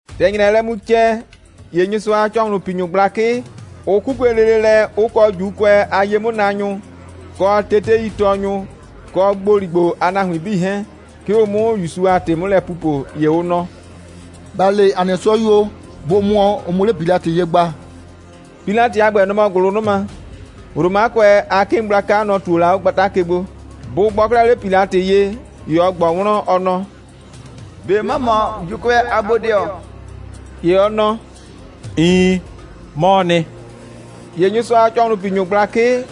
‑Tɛ ‑nyrɛɛ lɛ mu cɛ, ‑ye Nyɩsʋa a ‑cɔhlʋnpinyʋ gblakɩ, ʋ 'kukue lele lɛ, ʋ kɔ ‑Juukʋɛ a ye'mʋnaanyʋ, kɔ teteitɔɔnyʋ, kɔ ‑gboligbo a nahuin 'bii 'hɛɛn, 'ke ʋ 'mʋ ‑Yusu a ‑tɩ 'mʋ lɛ pupo. ‑Ye ʋ nɔ: «‑Ba le ‑a nɩ 'sɔyuo, bʋ mʋɔ, ʋ 'muo 'le Pilatɩ ye gba.» Pilatɩ a ‑gbɛ, nɔ‑ mɔ ‑gʋlʋnʋma. (Romakʋɛ a 'kɩɩn gblaka, nɔ‑ ꞊tuo la 'o gbata ke gbo.) Bʋ gbɔ 'klɛɛ 'le Pilatɩ ye, ‑ye ɔ ꞊gbɔ wlɔn, ɔ nɔ: «꞊Be ‑mɔ mɔ ‑Juukʋɛ a bodɩɔ?» ‑Ye ɔ nɔ: «Iin, 'mɔɔ nɩ.» ‑Ye Nyɩsʋa a ‑cɔhlʋnpinyʋ gblakɩ,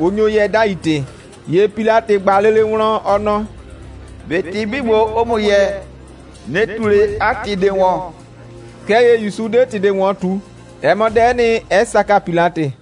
ʋ nyo yɛɛ 'dai ‑tɩ. ‑Ye Pilatɩ ꞊gba lele wlɔn, ɔ nɔ: «꞊Be ‑tɩ 'bii ‑gbo, ʋʋ ‑mʋ yɛɛ, ꞊nɩ ꞊tu ꞊le 'a ‑tɩ ꞊de ‑wɔn?» Kɛɛ ‑ye ‑Yusu 'de ‑tɩ ꞊de ‑wɔn ꞊tu. Ɛ mɔ dɛ'ɛ nɩ, 'ɛ saka Pilatɩ.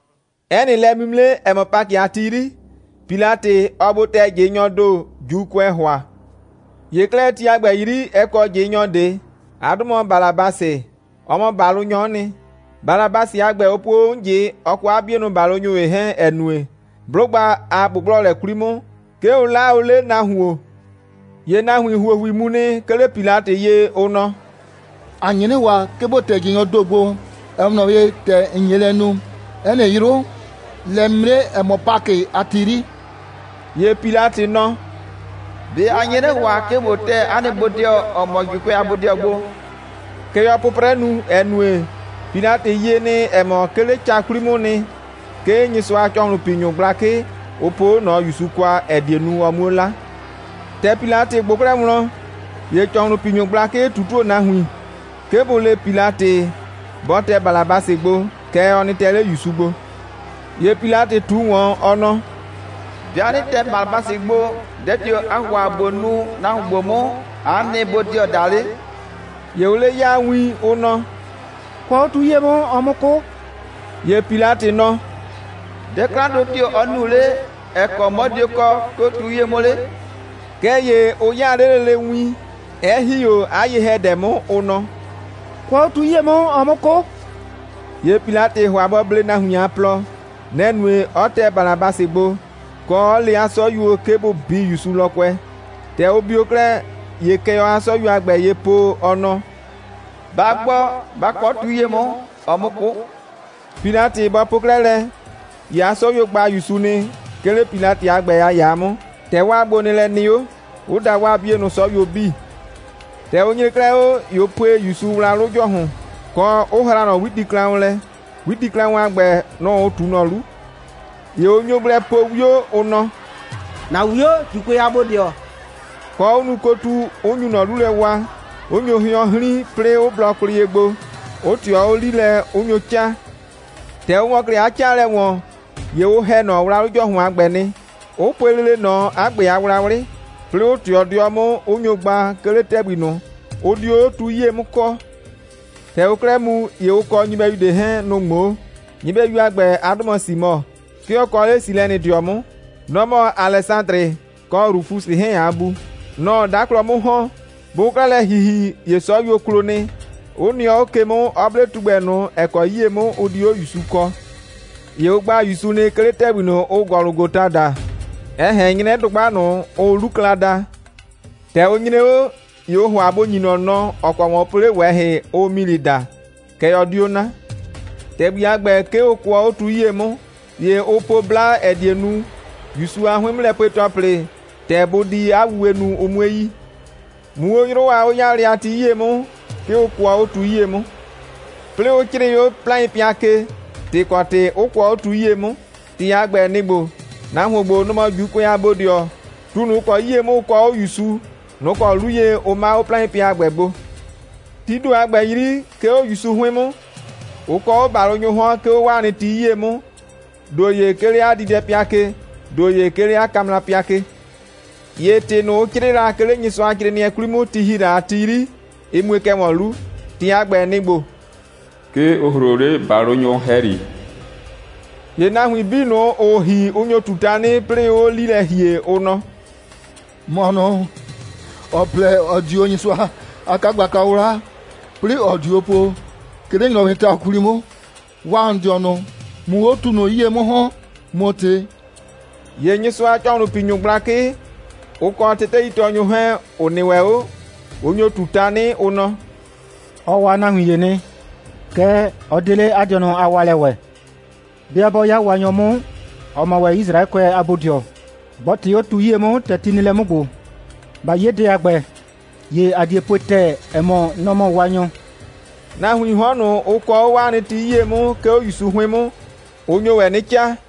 'Ɛ nɩ lɛ'mimre, ‑ɛ mɔ Pakɩ a ti 'yri, Pilatɩ, ɔɔ gbo tɛ ꞊jɩnyɔɔ ‑do, ‑Juukʋɛɛ ‑hʋa. ‑Ye 'klɛɛ, ti a ‑gbɛ 'yri, ɛ kɔ ꞊jɩnyɔ ꞊de. 'A 'dʋ mɔ Balabasɩ. Ɔ mɔ ‑balʋnyɔ'ɔ nɩ. Balabasɩ a ‑gbɛ, ʋ puo o 'mʋ ꞊jɩ, ɔ kɔ 'a 'bienʋ ‑balʋnyʋ ‑ye 'hɛɛn, ‑ɛ nue, 'blʋgba a ꞊gbʋgblɔlɛ 'kwli 'mʋ, 'ke ʋ 'laa o 'le nahuon. ‑Ye nahuin ‑huohui mu nɩ, 'ke 'le Pilatɩ ye, ʋ nɔ: «‑A nye 'nɩ ‑hʋa, 'ke ‑bo tɛ ꞊jɩnyɔɔ ‑do gbo, ‑ɛ 'we ꞊nɔ ye, ‑tɛ ‑n nye lɛ nu 'ɛ nɩ 'yrʋ, lɛ'mimre, ‑ɛ mɔ Pakɩ a ti 'yri.» ‑Ye Pilatɩ nɔ: «꞊Be a nye 'nɩ ‑hʋa, 'ke ꞊bo tɛ 'a nɩ bodɩɔ, ‑ɔ mɔ ‑Juukʋɛ a bodɩɔ gbo?» Kɛ ɔɔ 'pʋprɛ nu, ‑ɛ nue, Pilatɩ yie nɩ, ‑ɛ mɔ, 'ke 'le ca 'kwli 'mʋʋ nɩ, 'ke Nyɩsʋa a ‑cɔhlʋnpinyʋ gblakɩ, ʋ poo 'o ꞊nɔ ‑Yusu kwa, ‑ɛ die nu, ɔ 'muo 'la. ‑Tɛ Pilatɩ ꞊gbʋ 'klɛɛ wlɔn, ‑ye ‑cɔhlʋnpinyʋ gblakɩ ꞊tutuo nahuin, 'ke bʋ le Pilatɩ, bɔ tɛ Balabasɩ gbo, kɛɛ, ɔ nɩ tɛ 'le ‑Yusu gbo. ‑Ye Pilatɩ ꞊tu ‑wɔn, ɔ nɔ: «'Bɩa 'nɩ tɛ Balabasɩ gbo, dɛ tio‑ aa ‑hʋa ꞊bo nu nahuon ‑gbo 'mʋ, aa 'a nɩ bodɩɔ daa 'le?» ‑Ye ʋʋ 'le 'yaa win, ʋ nɔ: «Kʋɔ 'o tu 'yie 'mʋ, ɔ 'mʋ 'kʋ!» ‑Ye Pilatɩ nɔ: «Dɛ 'klandʋ tio‑ ɔ nu 'le, ‑ɛ kɔ 'mɔ dio kɔɔ, 'ke 'o tu 'yie 'mʋ 'le?» Kɛɛ ‑ye ʋ 'yaa 'le lele win, 'ɛ ‑hi 'o 'a ye‑hɛdɛ 'mʋ, ʋ nɔ: «Kʋɔ 'o tu 'yie 'mʋ, ɔ 'mʋ 'kʋ!» ‑Ye Pilatɩ ‑hʋa bɔ blee nahuin a plɔ. Nɛ‑ nue, 'ɔ tɛ Balabasɩ gbo, kɔ, 'ɔ le 'a 'sɔyuo, 'ke bʋ bii ‑Yusu lɔkʋɛ. ‑Tɛ ʋ bio 'klɛɛ, ‑ye kɛ ɔɔ 'a 'sɔyuo a ‑gbɛ ye po, ɔ nɔ: «Ba gbɔ, ba kʋɔ 'o tu 'yie 'mʋ, ɔ 'mʋ 'kʋ!» Pilatɩ bɔ po 'klɛɛ lɛ, ‑ye 'a 'sɔyuo gba ‑Yusu nɩ, 'ke 'le Pilatɩ a ‑gbɛ a ‑yaa 'mʋ, ‑tɛ 'waa gbonɩɩlɛ nɩ 'o, 'ʋ da 'waa 'bienʋ 'sɔyuo 'bii. ‑Tɛ ʋ nyre 'klɛɛ 'o, ‑ye ʋ pue ‑Yusu wlawlʋ ‑jɔhʋn, kɔ 'ʋ hraa ꞊nɔ 'witiklaʋn lɛ. 'Witiklaʋn a ‑gbɛ, nʋ‑ ʋ ꞊tu ꞊nɔ 'lu. ‑Ye ʋ nyo gblɛ po 'wio, ʋ nɔ: «‑Na 'wio, ‑Juukʋɛ a bodɩɔ,» kɔ, 'ʋ nu kotu, 'ʋ nyu ꞊nɔ 'lu lɛ waa, 'ʋ nyo hɩɔn 'hrin, 'plɩɩ 'ʋ blɔ kwlɩ ye gbo, 'ʋ ꞊tɩɔ 'o 'li lɛ, 'ʋ nyo 'caa. ‑Tɛ ʋ ‑wɔ 'klɛɛ 'a 'caalɛ ‑wɔn, ‑ye ʋ ‑hɛ ꞊nɔ wlawlʋ ‑jɔhʋn a ‑gbɛ nɩ, 'ʋ pue lele ꞊nɔ 'a ‑gbɛ a wlawlɩ, 'plɩɩ 'ʋ ꞊tɩɔ 'dɩɔ 'mʋ, 'ʋ nyo gba, 'ke 'le ‑tɛgbi ꞊nʋ, ʋ dio 'o tu 'yie 'mʋ kɔɔ. ‑Tɛ ʋʋ 'klɛɛ mu, ‑ye ʋ kɔ nyɩbɛyu ꞊de 'hɛɛn, nʋ‑ ꞊ŋmoo. Nyɩbɛyu a ‑gbɛ, 'a 'dʋ mɔ Simɔ. 'Ke ɔ kɔ 'le Silɛnɩdɩɔ 'mʋ. Nɔ‑ mɔ Alɛsadrɩ kɔ Rufusɩ 'hɛɛn a bu. Nɔ‑ɔ 'daklɔ 'mʋ ‑hɔn. Bʋʋ 'klɛɛ lɛ ‑hihi, ‑ye 'sɔyuo klo nɩ, 'ʋ nɩɔ 'o ke 'mʋ, 'ɔ 'ble tugbɛ ꞊nʋ, ‑ɛ kɔ 'yie 'mʋ ʋ di 'o ‑Yusu kɔɔ. ‑Ye ʋ gba ‑Yusu nɩ, 'ke 'le ‑tɛgbi ꞊nʋ, ʋʋ Gɔlʋgɔta daa, ‑ɛ ꞊hɛn 'nyrɛ dʋgba ꞊nʋ, ʋʋ 'Lukla daa. ‑Tɛ ʋ nyre 'o, ‑ye ʋʋ ‑hʋa bʋ ‑nyi ꞊nɔ nɔ, ‑ɔ kɔ ‑wɔn ʋ po 'le ꞊wɛhɩ, ʋʋ milɩ daa, kɛɛ, ɔ 'dio 'na. ‑Tɛgbi a ‑gbɛ, 'ke ʋ kʋɔ 'o tu 'yie 'mʋ. ‑Ye ʋ po 'bla, ‑ɛ die nu, ‑Yusu a 'hʋɩn'mʋlɛpue‑tɔplɩ, ‑tɛ bʋ di 'a wuwe nu, ʋ 'mue yi. Muu 'o 'yrʋ a 'o'yaalɛ a ti 'yri, 'ke ʋ kʋɔ 'o tu 'yie 'mʋ. 'Plɩɩ 'ʋ 'crɩɩ 'o 'plaɩnpɩa ke, ‑tɩ ‑kɔ ‑tɩ 'ʋ kʋɔ 'o tu 'yie 'mʋ. ‑Tɩ a ‑gbɛ, nɩ‑ ‑gbo: «Nahuon ‑gbo, nɔ‑ mɔ ‑Juukʋɛ a bodɩɔ.» (Tu ꞊nʋ, ‑ʋ kɔ 'yie 'mʋ ʋ kɔɔ 'o ‑Yusu, nʋ‑ kɔ 'lu ye 'ke ʋ 'maa 'o 'plaɩnpɩa a ‑gbɛ gbo.) Tii ‑do a ‑gbɛ 'yri, 'ke 'o ‑Yusu 'hʋɩn 'mʋ, ʋ kɔɔ 'o ‑balʋnyʋʋ 'hɔn, 'ke 'o 'waa nɩ ti 'yie 'mʋ, ‑do ‑ye 'ke 'le 'a diidɛpɩa ke, ‑do ‑ye 'ke 'le 'a kamrapɩa ke. [ ‑Ye ‑tɩ ꞊nʋ, ʋ 'crɩɩ, la 'ke 'le Nyɩsʋacrɩɩnɩɛ 'kwli 'mʋ ti ‑hi la a ti 'yri, ɩ mue kɛ ‑wɔn 'lu. ‑Tɩ a ‑gbɛ, nɩ‑ ‑gbo: «'Ke ʋ ‑hroo 'le ‑balʋnyʋ ‑hɛyri.»] ‑Ye nahuin 'bii ꞊nʋ, ‑ʋʋ ‑hi, ʋ nyo ꞊tu tanɩ, 'plɩɩ 'ʋʋ 'o 'li lɛ ‑hie, ʋ nɔ: «‑Mɔ ꞊nʋ, ‑ɔ plɛ, ‑ɔ di o Nyɩsʋa a 'kagblaka 'wla, 'plɩɩ ‑ɔ diu o po, 'ke 'le ‑nyrɔwɩɩ ta 'kwli 'mʋ, waa ‑n dɩɔnʋ, ꞊mʋ 'o tu ꞊nʋ 'yie 'mʋ ‑hɔn, ꞊mʋ ꞊tɩ.» ‑Ye Nyɩsʋa a ‑cɔhlʋnpinyʋ gblakɩ, ʋ kɔ teteitɔɔnyʋ 'hɛɛn, ‑ʋ nɩ ‑wɛ 'o, ʋ nyo ‑wɛ ꞊tu tanɩ, ʋ nɔ: «Ɔ waa nahuin ‑ye nɩ, kɛɛ, ɔ 'de 'le 'a dɩɔnʋ a waalɛ ‑wɛ. 'Bɩa 'bɔ 'ya Waanyɔ 'mʋ, ‑ɔ mɔ ‑wɛ Yisraɛkʋɛ a bodɩɔ, bɔ ꞊tɩ 'o tu 'yie 'mʋ, ‑tɛ ti nɩ lɛ 'mʋ ‑gbo. ꞊Ba 'ye dɛ a ‑gbɛ, ‑ye ‑a die pue ‑tɛɛ, ‑ɛ mɔ, nɔ‑ mɔ Waanyɔ.» Nahuiin 'hɔn ꞊nʋ, ʋ kɔɔ 'o 'waa nɩ ti 'yie 'mʋ, 'ke 'o ‑Yusu 'hʋɩn 'mʋ, ʋ nyo ‑wɛ 'nɩ 'caa.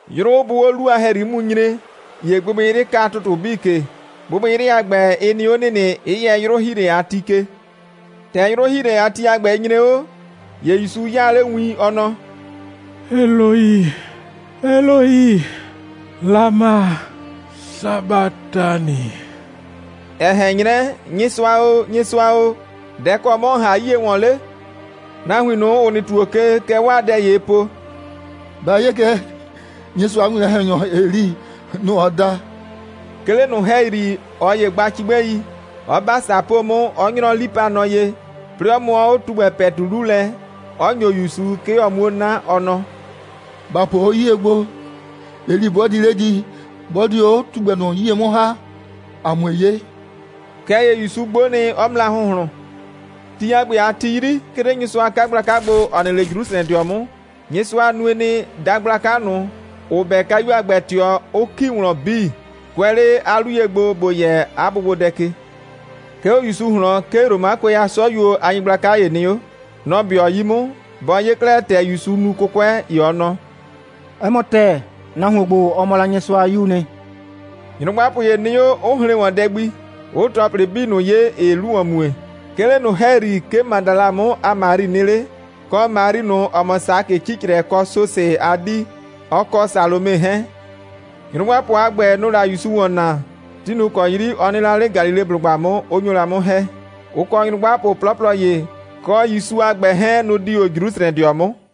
'Yrʋ bʋʋ 'o 'lu a ‑hɛyri 'mʋ mu nyre, ‑ye gbɩgbɩyrɩ ka ‑tʋtʋ 'bii ke. Gbɩgbɩyrɩ a ‑gbɛ, ɩ nɩ 'o ‑nɩnɩ, 'ɛ yɛ 'yrʋ‑hiilɛ a ti ke. ‑Tɛ 'yrʋ‑hiilɛ a ti a ‑gbɛ, ɩ nyre 'o, ‑ye ‑Yusu 'yaa 'le win, ɔ nɔ: «Eloi, Eloi, lama sabatani?» ‑ɛ ꞊hɛn 'nyrɛ: «Nyɩsʋa o, Nyɩsʋa o, dɛ‑ kɔ 'mɔ ‑n ‑ha 'yie ‑wɔn 'le?» Nahuin ꞊nʋ, ‑ʋ nɩ ‑tuo ke, kɛ 'waa dɛ ‑yee po: «Ba 'ye kɛ, Nyɩsʋa a winwlɔn‑hɛnyɔ Eli, nɔ‑ ɔɔ da.» 'Ke 'le ꞊nʋ ‑hɛyri, ꞊ɔ ‑ye gba cigbɛi, 'ɔ 'ba ‑sapoo 'mʋ, 'ɔ 'nyrɔ 'lipanɔ ye, 'plɩɩ 'ɔ mʋɔ 'o tugbɛ ‑pɛtu 'lu lɛ, 'ɔ ‑nyo ‑Yusu, 'ke ɔ 'muo 'na. Ɔ nɔ: «‑Ba po 'o 'yie gbo, Eli 'bɔ di 'le di, 'bɔ dio 'o tugbɛ ꞊nʋ 'yie 'mʋ ‑ha, ‑a 'mue 'ye.» Kɛɛ ‑ye ‑Yusu 'gbo nɩ, 'ɔ mra ‑hʋnhlʋn. Ti a ‑gbɛ a ti 'yri, 'ke 'le Nyɩsʋa a 'kagblaka gbo, ‑ɔ nɩ 'le Jrusrɛdɩɔ 'mʋ, Nyɩsʋa nue nɩ, dagblaka ꞊nʋ, ‑ʋ 'bɛ kayu a ‑gbɛ ꞊tɩɔ, 'ʋ ‑ki wlɔn 'bii, kʋɛ 'le 'a 'lu ye gbo, ‑bo yɛ 'a bʋgbodɛ ke. 'Ke 'o ‑Yusu ꞊hlɔn, 'ke Romakʋɛ a 'sɔyuo a nyɩgblaka ‑ye nɩ 'o. Nɔ‑ 'bɩɔ 'yi 'mʋ. Bɔ 'ye 'klɛɛ, ‑tɛ ‑Yusu nu 'kʋkʋɛ, ‑ye ɔ nɔ: «'Ɛ mɔ ‑tɛɛ, nahuon ‑gbo, ɔ mɔ la Nyɩsʋa a 'Yuu nɩ.» Nyrʋgbapʋ ‑ye nɩ 'o, 'ʋ hren ‑wɔn dɛ gbi, 'ʋʋ ‑tɔplɩ 'bii ꞊nʋ 'ye, ‑ɩɩ 'lu ‑wɔn mue. 'Ke 'le ꞊nʋ ‑hɛyri, 'ke Madala 'mʋ a Mari nɩ 'le, kɔ Mari ꞊nʋ, ‑ɔ mɔ Sakɩ 'cicrɛ kɔ Sosɩ a 'dii, ɔ kɔ Salome 'hɛɛn. Nyrʋgbapʋ a ‑gbɛ, nʋ‑ʋ la ‑Yusu ‑wɔn naa, ti ꞊nʋ ‑kɔ 'yri ɔ nɩ la 'le Galileblʋgba 'mʋ, 'ʋ nyo la 'mʋ ‑hɛ. Ʋ kɔ nyrʋgbapʋ 'plɔplɔ ‑ye, kɔ ‑Yusu a ‑gbɛ 'hɛɛn, nʋ‑ di o Jrusrɛdɩɔ 'mʋ.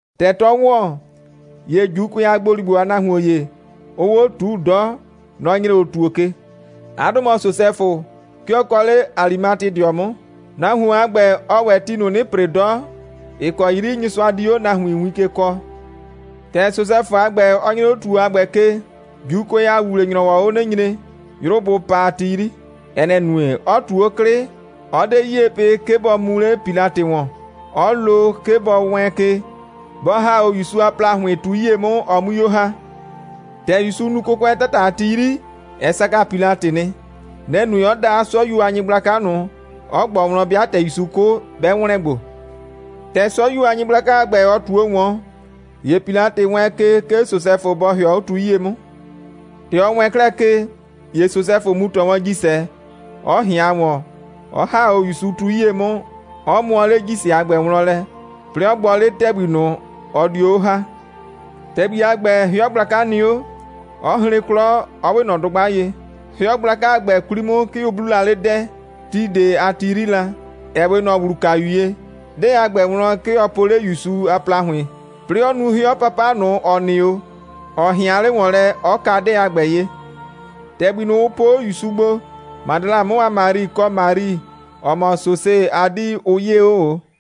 ‑Tɛ 'tɔɔ ‑wɔn, ‑ye ‑Juukʋɛ a ‑gboligbo a nahuon ‑ye, ʋʋ 'o ꞊tuu 'dɔ, nɔ‑ nyre 'o ‑tuo ke. 'A 'dʋ mɔ Sosɛfʋ. 'Ke ɔ kɔ 'le Alimatedɩɔ 'mʋ. Nahuon a ‑gbɛ, ɔɔ ‑wɛ ti ꞊nʋ 'nɩ ‑pre 'dɔ, ‑ɩ kɔ 'yri Nyɩsʋa di 'o nahuin win ke kɔɔ. ‑Tɛ Sosɛfʋ a ‑gbɛ, ɔ nyre 'o ‑tuo a ‑gbɛ ke, ‑Juukʋɛ a ‑wuwle‑nyrɔwɔɔ 'o 'nɩ nyre, 'yrʋ bʋ pa a ti 'yri. Ɛ nɛ‑ nue, 'ɔ ꞊tu 'o 'klɩ, 'ɔ 'de 'yie pɩ, 'ke bɔ mu 'le Pilatɩ ‑wɔn, 'ɔ lo, 'ke bɔ wɛɛn ke, bɔ ‑ha 'o ‑Yusu a ‑plahʋɩn tu 'yie 'mʋ, ɔ 'mui 'o ‑ha. ‑Tɛ ‑Yusu nu 'kʋkʋɛ 'tata a ti 'yri, ɛ saka Pilatɩ nɩ. Nɛ‑ nue, 'ɔ da 'a 'sɔyuo a nyɩgblaka ꞊nʋ, 'ɔ ꞊gbɔ wlɔn, 'bɩa ‑tɛ ‑Yusu 'kʋ, 'bɛ ‑wlɛn gbo. ‑Tɛ 'sɔyuo a nyɩgblaka a ‑gbɛ, ɔ ꞊tuo ‑wɔn, ‑ye Pilatɩ wɛɛn ke, 'ke Sosɛfʋ bɔ ‑hɩɔ 'o tu 'yie 'mʋ. ‑Tɛ ɔ wɛɛn 'klɛɛ ke, ‑ye Sosɛfʋ mu ‑tɔ wɔn ‑jisɛ, 'ɔ ꞊hɩan ‑wɔn, 'ɔ ‑ha 'o ‑Yusu tu 'yie 'mʋ, 'ɔ mʋɔ 'le ‑jisɛ a ‑gbɛ wlɔn lɛ, 'plɩɩ 'ɔ gbɔ 'le ‑tɛgbi ꞊nʋ, ɔ dio 'o ‑ha. ‑Tɛgbi a ‑gbɛ, 'hɩɔ gblaka nɩ 'o, 'ɔ hren 'klɔ, 'ɔ 'we ꞊nɔ dʋgba ye. 'Hɩɔ gblaka a ‑gbɛ 'kwli 'mʋ, 'ke ʋ 'bluu la 'le 'dɛɛ, (ti ꞊de a ti 'yri la, ‑ɛ 'we ꞊nɔ ‑wlukayu ye). 'Dɛɛ a ‑gbɛ wlɔn, 'ke ɔ po 'le ‑Yusu a ‑plahʋɩn, 'plɩɩ 'ɔ nu 'hɩɔ 'papa ꞊nʋ, ‑ɔ nɩ 'o, ‑ɔ ꞊hɩan 'le ‑wɔn lɛ, 'ɔ ka 'dɛɛ a ‑gbɛ ye. ‑Tɛgbi ꞊nʋ, ʋ po 'o ‑Yusu gbo, Madala 'mʋ a Mari, kɔ Mari, ‑ɔ mɔ Sosɩ a 'dii, ʋ 'yee 'o ꞊o.